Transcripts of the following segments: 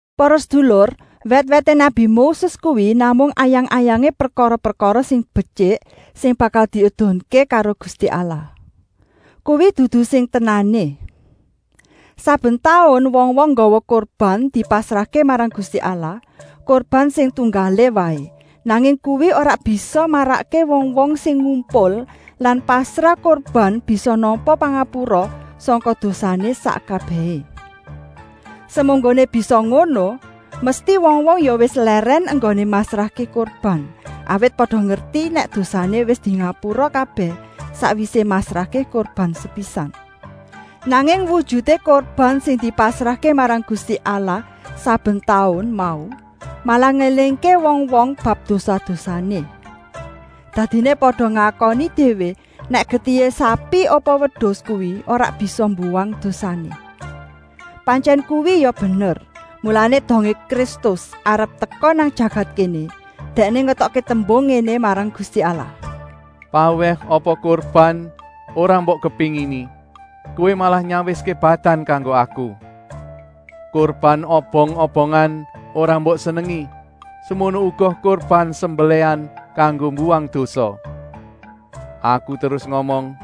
Para sedulur, wèt-wèté nabi Moses kuwi namung ayang-ayangé prekara-prekara sing betyik sing bakal diedunké karo Gusti Allah. Kuwi dudu sing tenané. Saben taun wong-wong nggawa kurban dipasrahké marang Gusti Allah, kurban sing tunggalé waé, nanging kuwi ora bisa marakké wong-wong sing ngumpul lan pasrah kurban bisa nampa pangapura sangka dosané sak kabèhé. Semunggoné bisa ngono, mesti wong-wong ya wis lèrèn enggoné masrahké kurban, awit pada ngerti nèk dosané wis dingapura kabèh sakwisé masrahké kurban sepisan. Nanging wujuté kurban sing dipasrahké marang Gusti Allah saben taun mau malah ngélingké wong-wong bab dosa-dosané. Dadiné pada ngakoni déwé nèk getihé sapi apa wedus kuwi ora bisa mbuwang dosané. Pantyèn kuwi ya bener, mulané dongé Kristus arep teka nang jagat kéné, Dèkné ngetokké tembung ngéné marang Gusti Allah: “Pawèh apa kurban ora mbok kepéngini, Kowé malah nyawiské badan kanggo Aku. Kurban obong-obongan ora mbok senengi, semono uga kurban sembelèhan kanggo mbuwang dosa. Aku terus ngomong: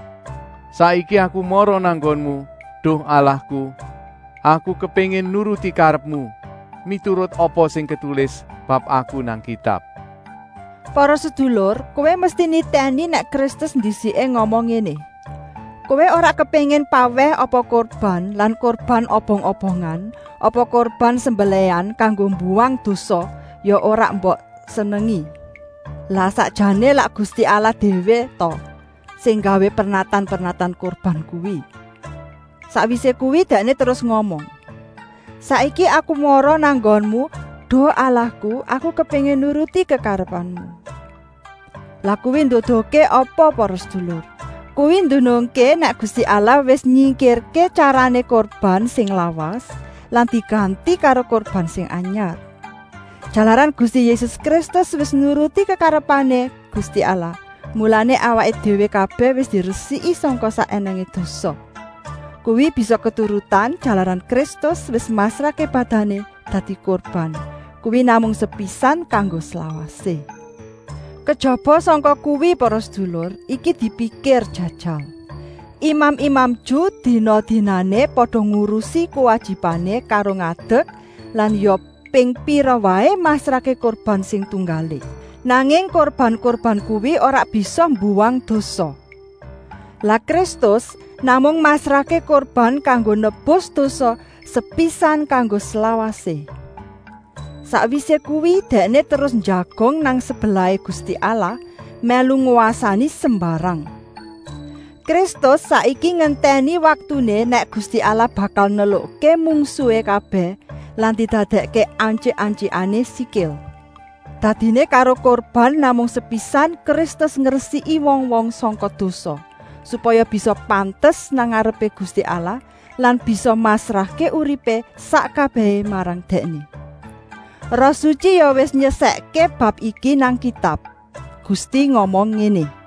‘Saiki Aku mara nang nggonmu, duh Allahku. Aku kepéngin nuruti karepmu, miturut apa sing ketulis bab Aku nang Kitab.’” Para sedulur, kowé mesti nitèni nèk Kristus ndisiké ngomong ngéné: “Kowé ora kepéngin pawèh apa kurban lan kurban obong-obongan apa kurban sembelèhan kanggo mbuwang dosa ya ora mbok senengi.” Lah sakjané lak Gusti Allah déwé ta sing nggawé pernatan-pernatan kurban kuwi? Sakwisé kuwi Dèkné terus ngomong: “Saiki Aku mara nang nggonmu, duh Allahku, Aku kepéngin nuruti kekarepanmu.” Lah kuwi nduduhké apa para sedulur? Kuwi ndunungké nèk Gusti Allah wis nyingkirké tyarané kurban sing lawas lan diganti karo kurban sing anyar. Jalaran Gusti Yésus Kristus wis nuruti kekarepané Gusti Allah, mulané awaké déwé kabèh wis diresiki sangka sak ènèngé dosa. Kuwi bisa keturutan, jalaran Kristus wis masrahké badané dadi kurban, kuwi namung sepisan kanggo slawasé. Kejaba sangka kuwi para sedulur, iki dipikir jajal. Imam-imam Ju dina-dinané pada ngurusi kuwajibané karo ngadek lan ya ping pira waé masrahké kurban sing tunggalé. Nanging kurban-kurban kuwi ora bisa mbuwang dosa. Lah Kristus namung masrahké kurban kanggo nebus dosa sepisan kanggo slawasé. Sakwisé kuwi dèkné terus njagong nang sebelahé Gusti Allah, mèlu ngwasani sembarang. Kristus saiki ngentèni waktuné nèk Gusti Allah bakal nelukké mungsuhé kabèh lan didadèkké antyik-antyikané sikil. Dadiné karo kurban namung sepisan Kristus ngresiki wong-wong sangka dosa, supaya bisa pantes nang ngarepé Gusti Allah lan bisa masrahké uripé sak kabèhé marang Dèkné. Roh Sutyi ya wis nyeksèkké bab iki nang Kitab. Gusti ngomong ngéné: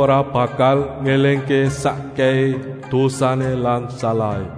“Aku ora bakal ngélingké sakkèhé dosané lan salahé.”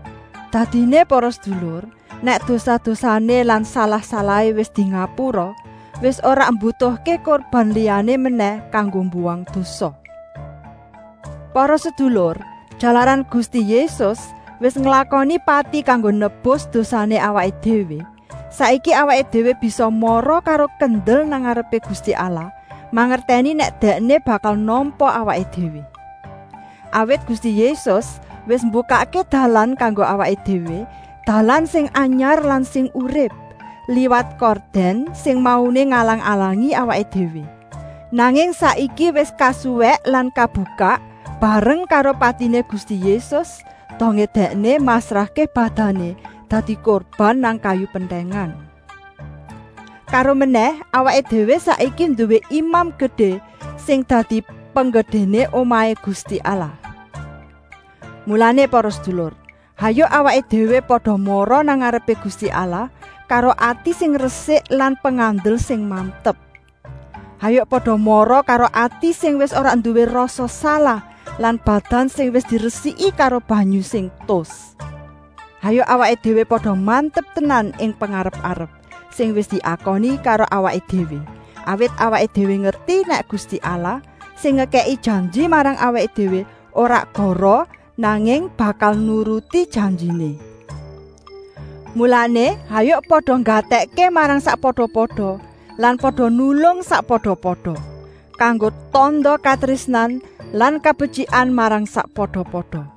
Dadiné para sedulur, nèk dosa-dosané lan salah-salahé wis dingapura, wis ora mbutuhké kurban liyané menèh kanggo mbuwang dosa. Para sedulur, jalaran Gusti Yésus wis nglakoni pati kanggo nebus dosané awaké déwé, saiki awaké déwé bisa mara karo kendel nang ngarepé Gusti Allah, mangertèni nèk Dèkné bakal nampa awaké déwé. Awit Gusti Yésus wis mbukakké dalan kanggo awaké déwé, dalan sing anyar lan sing urip, liwat kordèn sing mauné ngalang-alangi awaké déwé, nanging saiki wis kasuwèk lan kebukak, bareng karo patiné Gusti Yésus, dongé dèkné masrahké badané dadi kurban nang kayu pentèngan. Karomenèh awaké déwé saiki nduwé Imam Gedé sing dadi penggedéné omahé Gusti Allah. Mulané para sedulur, hayuk awaké déwé pada mara nang ngarepé Gusti Allah karo ati sing resik lan pengandel sing mantep. Hayuk pada mara karo ati sing wis ora nduwé rasa salah lan badan sing wis diresiki karo banyu sing tus. Hayuk awaké déwé pada mantep tenan ing pengarep-arep sing wis diakoni karo awaké déwé, awit awaké déwé ngerti nèk Gusti Allah, sing ngekèki janji marang awaké déwé, ora goroh, nanging bakal nuruti janjiné. Mulané, hayuk pada nggatèkké marang sakpada-pada lan pada nulung sakpada-pada, kanggo tanda katrésnan lan kabetyikan marang sakpada-pada.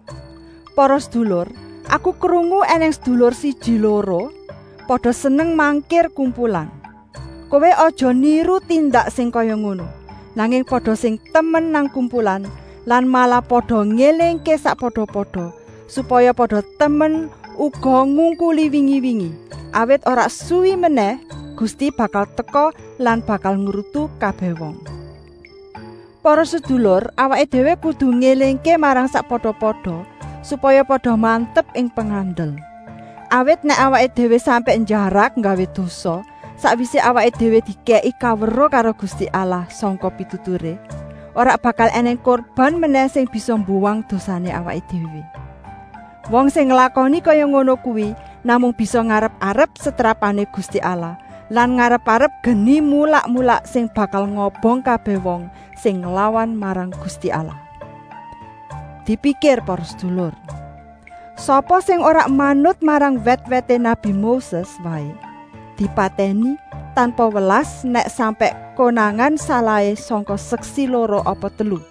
Para sedulur, aku krungu ènèng sedulur siji-loro pada seneng mangkir kumpulan. Kowé aja niru tindak sing kaya ngono, nanging pada sing temen nang kumpulan lan malah pada ngélingké sakpada-pada, supaya pada temen uga ngungkuli wingi-wingi, awit ora suwi menèh Gusti bakal teka lan bakal ngrutu kabèh wong. Para sedulur, awaké déwé kudu ngélingké marang sakpada-pada, supaya pada mantep ing pengandel. Awit nèk awaké déwé sampèk njarak nggawé dosa sakwisé awaké déwé dikèki kaweruh karo Gusti Allah sangka pituturé, ora bakal ènèng kurban menèh sing bisa mbuwang dosané awaké déwé. Wong sing nglakoni kaya ngono kuwi namung bisa ngarep-arep setrapané Gusti Allah lan ngarep-arep geni mulak-mulak sing bakal ngobong kabèh wong sing nglawan marang Gusti Allah. Dipikir para sedulur! Sapa sing ora manut marang wèt-wèté nabi Moses waé dipatèni tanpa welas nèk sampèk konangan salahé sangka seksi loro apa telu.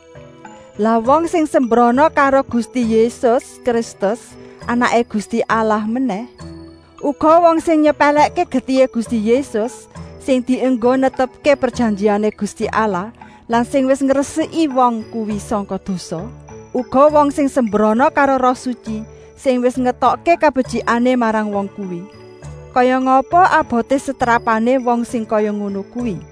Lah wong sing sembrana karo Gusti Yésus Kristus Anaké Gusti Allah menèh? Uga wong sing nyepèlèkké getihé Gusti Yésus sing dienggo netepké prejanjiané Gusti Allah lan sing wis ngresiki wong kuwi sangka dosa. Uga wong sing sembrana karo Roh Sutyi sing wis ngetokké kabetyikané marang wong kuwi. Kaya ngapa aboté setrapané wong sing kaya ngono kuwi.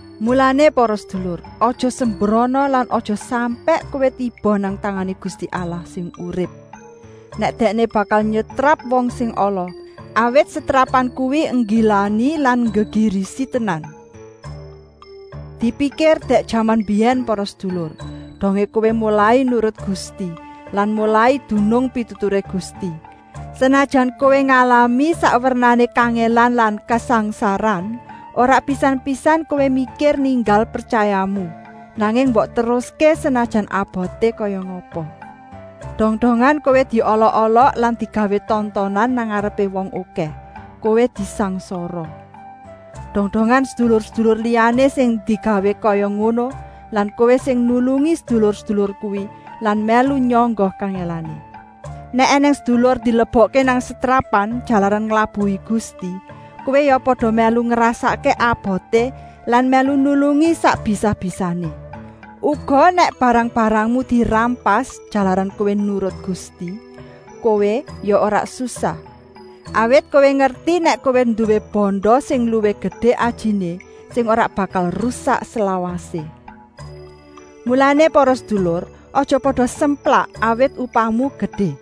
Mulané para sedulur, aja sembrana lan aja sampèk kowé tiba nang tangané Gusti Allah sing urip, nèk Dèkné bakal nyetrap wong sing ala, awit setrapan kuwi nggilani lan nggegirisi tenan. Dipikir dèk jaman mbiyèn para sedulur, dongé kowé molai nurut Gusti lan molai dunung pituturé Gusti; senajan kowé ngalami sak wernané kangèlan lan kasangsaran, ora pisan-pisan kowé mikir ninggal pretyayamu, nanging mbok teruské senajan aboté kaya ngapa. Dong-dongan kowé diolok-olok lan digawé tontonan nang ngarepé wong okèh, kowé disangsara. Dong-dongan sedulur-sedulur liyané sing digawé kaya ngono lan kowé sing nulungi sedulur-sedulur kuwi lan mèlu nyangga kangèlané. Nèk ènèng sedulur dilebokké nang setrapan jalaran nglabuhi Gusti, kowé ya pada mèlu ngrasakké aboté lan mèlu nulungi sak bisa-bisané. Uga nèk barang-barangmu dirampas jalaran kowé nurut Gusti, kowé ya ora susah, awit kowé ngerti nèk kowé nduwé banda sing luwih gedé ajiné, sing ora bakal rusak slawasé. Mulané para sedulur, aja pada semplak, awit upahmu gedé.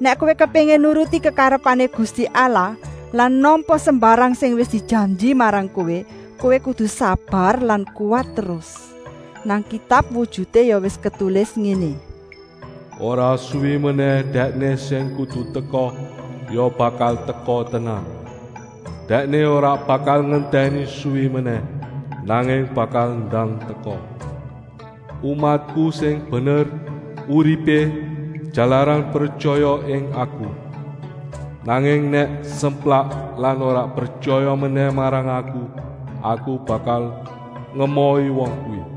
Nèk kowé kepéngin nuruti kekarepané Gusti Allah lan nampa sembarang sing wis dijanji marang kowé, kowé kudu sabar lan kuwat terus. Nang Kitab wujuté ya wis ketulis ngéné: “Ora suwi menèh Dèkné sing kudu teka ya bakal teka tenan. Dèkné ora bakal ngentèni suwi menèh, nanging bakal ndang teka. Umatku sing bener uripé jalaran pretyaya ing Aku. Nanging nèk semplak lan ora pretyaya menèh marang Aku, Aku bakal ngemohi wong kuwi.”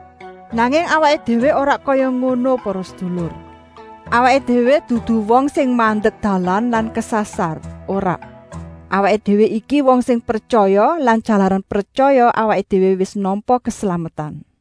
Nanging awaké déwé ora kaya ngono para sedulur. Awaké déwé dudu wong sing mandek dalan lan kesasar, ora. Awaké déwé iki wong sing pretyaya lan jalaran pretyaya awaké déwé wis nampa keslametan.